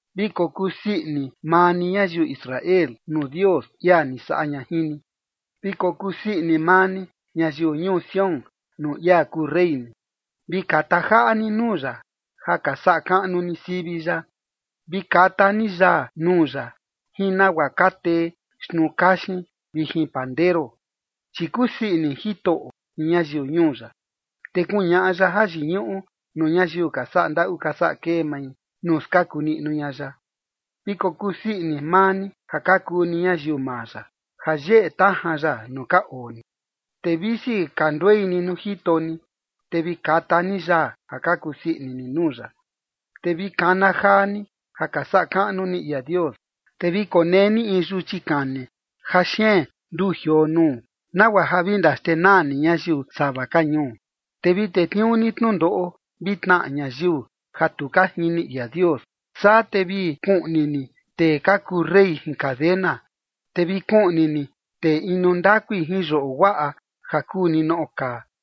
Vi kokusii ini maa ni, ñayiu Israel, nuu Dios, ia ni saꞌa ña jin ni. Vi kokusii ini maa ni, ñayiu ñuu Sión, nuu ia kuu rey ni. Vi kata jaꞌa ni nuu ya ja ka saꞌa kaꞌnu ni sivi ya. Vi kata ni yaa nuu ya jin nagua ka tee xtnuu kaxin vi jin pandero. Chi kusii ini Jitoꞌo jin ñayiu ñuu ya, te kuñaꞌa ya jayiñuꞌu nuu ñayiu ka saꞌa ndaꞌu ka saꞌa kee mai, nuu skaku niꞌnu ña ya. Vi kokusii ini maa ni ja ka kuu ni ñayiu maa ya, ja yeꞌe tajan ya nuu ka oo ni, te visi ka nduei ni nuu jito ni, te vi kata ni yaa ja ka kusii ini ni nuu ya. Te vi kana jaa ni ja ka saꞌa kaꞌnu ni ia Dios. Te vi konee ni in yuchi kani ja xeen nduu jioo nuu, nagua ja vi ndaxtenaa ni ñayiu sava ka ñuu, te vi tetniuu ni tnundoꞌo vi tnaꞌa ñayiu ja tu ka jini ia Dios. Saa te vi kuꞌni ni tee ka kuu rey jin cadena, te vi kuꞌni ni tee inu ndakui jin yoꞌo guaꞌa ja kuu ninoꞌo kaa,